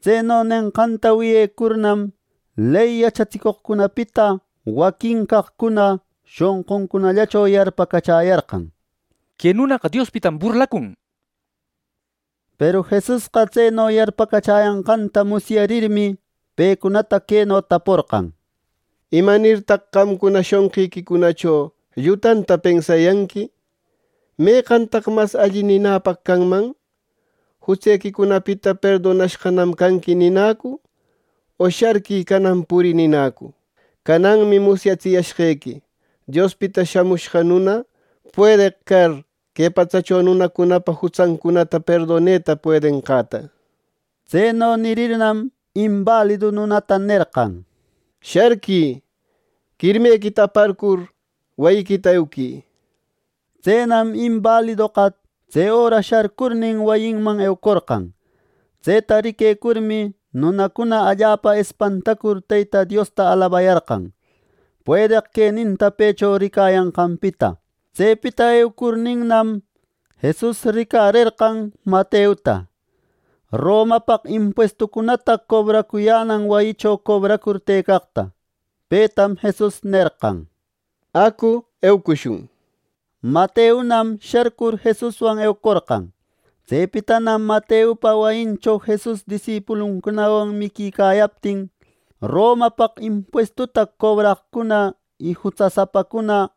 Tseno nenqanta wiyecurnam, ley yachatsicoqcunapita waquin caqcuna shonquncunallacho yarpacachäyarqan “Que nunaqa Diospitam burlacun” nir. Peru Jesusqa tseno yarpacachäyanqanta musyarirmi, pecunata queno taporqan: —¿Imanirtaq qamcuna shonqiquicunacho llutanta pensayanqui! ¿Meqantaq mas alli ninäpaq canman: ‘Jutsequicunapita perdonashqanam canqui’ ninäcu, o ‘¡Sharquï! ¡Canan purï!’ ninäcu! Cananmi musyatsiyashqequi, Diospita Shamushqa Nuna, puedeq car que patsacho nunacunapa jutsancunata perdoneta puedenqanta. Tseno nirirnam, imbalidu nunatana nerqan: —¡Sharquï! Quirmequita aparcur, wayiquita euquï —nir. Tsenam imbalidoqa tse öra sharcurnin, wayinman eucorqan. Tseta riquecurmi, nunacuna allapa espantacur Teyta Diosta alabayarqan, puedeq queninta pëcho ricayanqanpita. Tsepita eucurninnam, Jesus ricarerqan Mateota Romapaq impuestucunata cobracuyänan wayicho cobracur tëcaqta. Petam Jesus nerqan: —¡Acu eucushun! —nir. Mateonam sharcur Jesuswan eucorqan. Tsepitanam Mateopa wayincho Jesus disipuluncunawan miquicayaptin Romapaq impuestuta cobracoqcuna y jutsasapacuna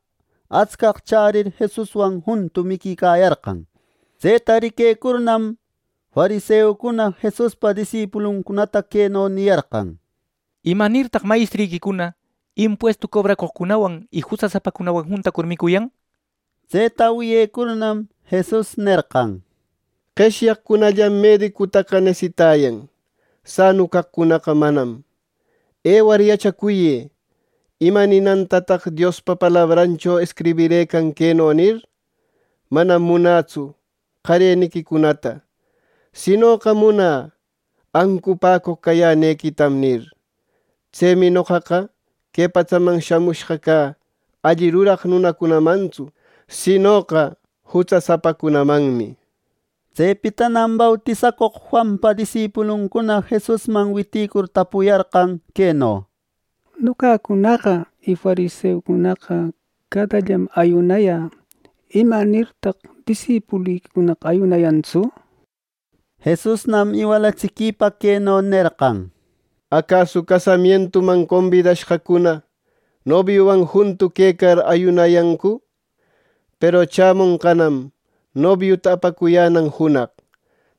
atscaq chärir Jesuswan juntu miquicayarqan. Tseta riquecurnam, fariseucuna Jesuspa disipuluncunata queno niyarqan: —¿Imanirtaq mayestriquicuna impuestu cobracoqcunawan y jutsasapacunawan juntacur micuyan! —nir. Tseta wiyecurnam, Jesus nerqan: —Qeshyaqcunallam medicutaqa nesitayan; sanu caqcunaqa manam. ¡Ëwar yachacuyë! ¿Ima ninantataq Diospa palabrancho escribirëcan queno nir, ‘Manam munätsu qareniquicunata; sinoqa munä ancupäcoq cayänequitam’ nir? Tsemi noqaqa que patsaman shamushqa cä alli ruraq nunacunamantsu, sinoqa jutsasapacunamanmi. Tsepitanam bautisacoq Juanpa disipuluncuna Jesusman witïcur tapuyarqan queno: —Noqacunaqa y fariseucunaqa cadallam ayunayä. ¿Imanirtaq disipuliquicunaqa ayunayantsu? —nir. Jesusnam iwalatsiquipa queno nerqan: —Acasu casamientuman combidashqacuna nobiuwan juntu quecar, ¿ayunayancu! Peru chämonqanam nobiuta apacuyänan junaq.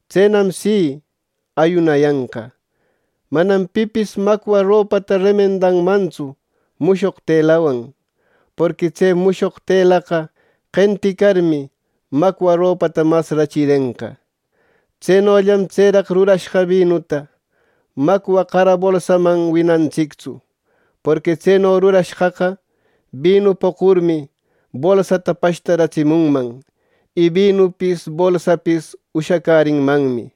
Tsenam si, ayunayanqa. “Manam pipis macwa ropata remendanmantsu mushoq telawan, porqui tse mushoq telaqa qenticarmi macwa ropata mas rachirenqa. Tsenollam tseraq rurashqa binuta macwa qara bolsaman winantsictsu; porqui tseno rurashqaqa, binu poqurmi bolsata pashtaratsimunman, y binupis bolsapis ushacärinmanmi.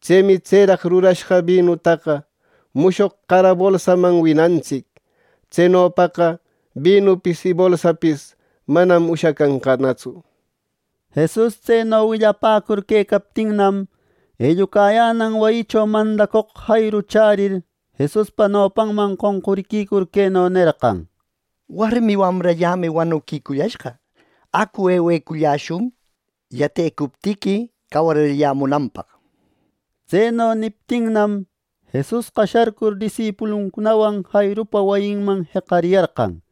Tsemi tseraq rurashqa binutaqa mushoq qara bolsaman winacuntsic. Tsenopaqa binupis y bolsapis manam ushacanqanatsu.” Jesus tseno willapäcur quecaptinnam, ellucayänan wayicho mandacoq Jairu chärir, Jesuspa nopanman qonquriquicur queno nerqan: —¡Warmi wamrallämi wanuquicushqa! ¡Acu, eweculläshun, yatecuptiqui cawarirallämunanpaq! —nir. Tseno niptinnam, Jesusqa sharcur disipuluncunawan Jairupa wayinman jeqariyarqan.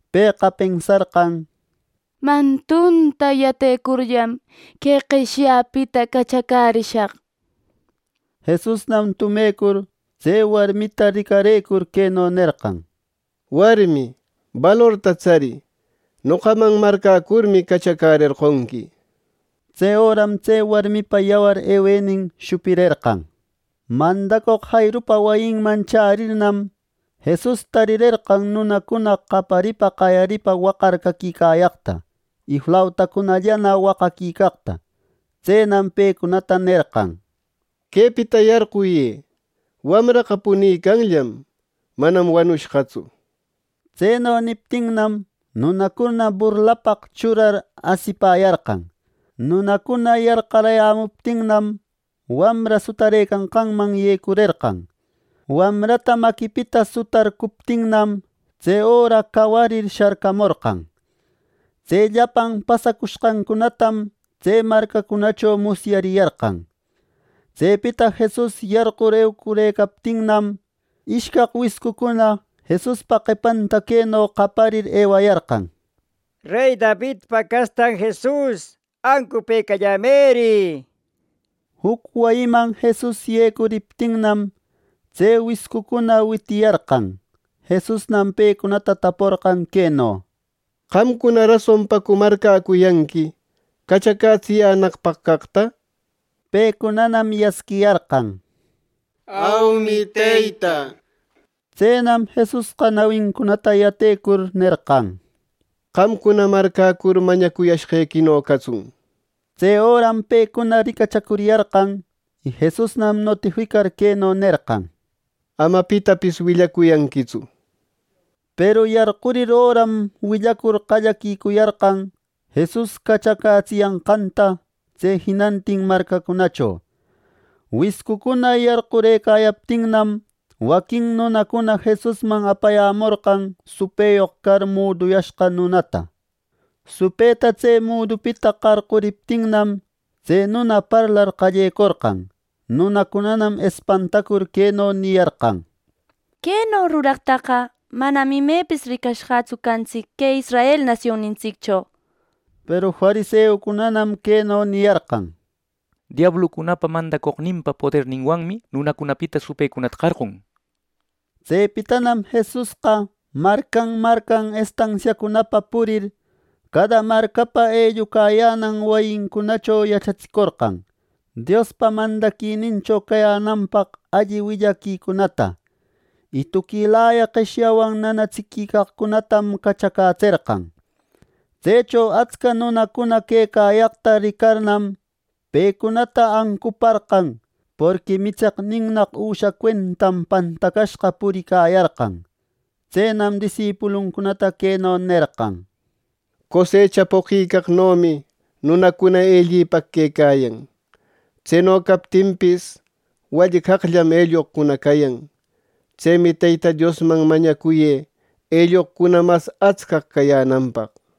Pëqa pensarqan: “Mantunta yatecurllam que qeshyäpita cachacärishaq” nirmi. Jesusnam tumecur tse warmita ricarëcur, queno nerqan: —Warmi, balorta tsarï, noqaman marcäcurmi cachacärerqonqui. Tse öram tse warmipa yawar ewenin shupirerqan. Mandacoq Jairupa wayinman chärirnam, Jesus tarirerqan nunacuna qaparipa qayaripa waqar caquicayaqta, y flautacunallana waqaquicaqta. Tsenam pecunata nerqan: —Quepita yarquyë. Wamraqa punicanllam. Manam wanushqatsu —nir. Tseno niptinnam, nunacuna burlapaq churar asipäyarqan. Nunacuna yarqarayämuptinnam, wamra sutarëcanqanman yecurerqan. Wamrata maquipita sutarcuptinnam, tse öra cawarir sharcaramorqan. Tse llapan pasacushqancunatam tse marcacunacho musyariyarqan. Tsepita Jesus yarqur eucurëcaptinnam, ishcaq wiscucuna Jesuspa qepanta queno qayarir ewayarqan: —¡Rey Davidpa castan Jesus, ancupëcalläyämëri! —nir. Juc wayiman Jesus yecuriptinnam, tse wiscucuna witiyarqan. Jesusnam pecunata taporqan queno: —¿Qamcuna rasonpacu marcäcuyanqui, cachacätsiyänaqpaq caqta? —nir. Pecunanam yasquiyarqan: —Aumi, Teyta —nishpa. Tsenam Jesusqa nawincunata yatecur, nerqan: —Qamcuna marcäcur mañacuyashqequino catsun —nir. Tse öram pecuna ricachacuriyarqan; y Jesusnam notificar queno nerqan: —¡Ama pitapis willacuyanquitsu! —nir. Peru, yarqurir öram willacur qallaquicuyarqan Jesus cachacätsiyanqanta, tse jinantin marcacunacho. Wiscucuna yarqurëcayaptinam, waquin nunacuna Jesusman apayämorqan supëyoq car muduyashqa nunata. Supëta tse mudupita qarquriptinnam tse nuna parlar qallecorqan. Nunacunanam espantacur queno niyarqan: —¡Queno ruraqtaqa manam imepis ricashqatsu cantsic que Israel nasionnintsiccho! —nir. Peru fariseucunanam queno niyarqan: —Diablucunapa mandacoqnin poderninwanmi nunacunapita supëcunata qarqun —nir. Tsepitanam Jesusqa marcan, marcan estansiacunapa purir, cada marcapa ellucayänan wayicunacho yachatsicorqan Diospa mandaquinincho cayänapaq alli willaquicunata. Y tuquilaya qeshyawan nanatsiquicaqcunatam cachacätserqan. Tsecho atscaq nunacuna quecayaqta ricarnam, pecunata ancuparqan, porqui mitseqninnnaq üsha cuentam pantacashqa puriquicayarqan. Tsenam disipuluncunata queno nerqan: —Cosecha poqicaqnomi nunacuna ellipaq quecayan. Tseno captinpis, wallcallam elloqcuna cayan. Tsemi Teyta Diosman mañacuyë elloqcuna mas atscaq cayänanpaq —nir.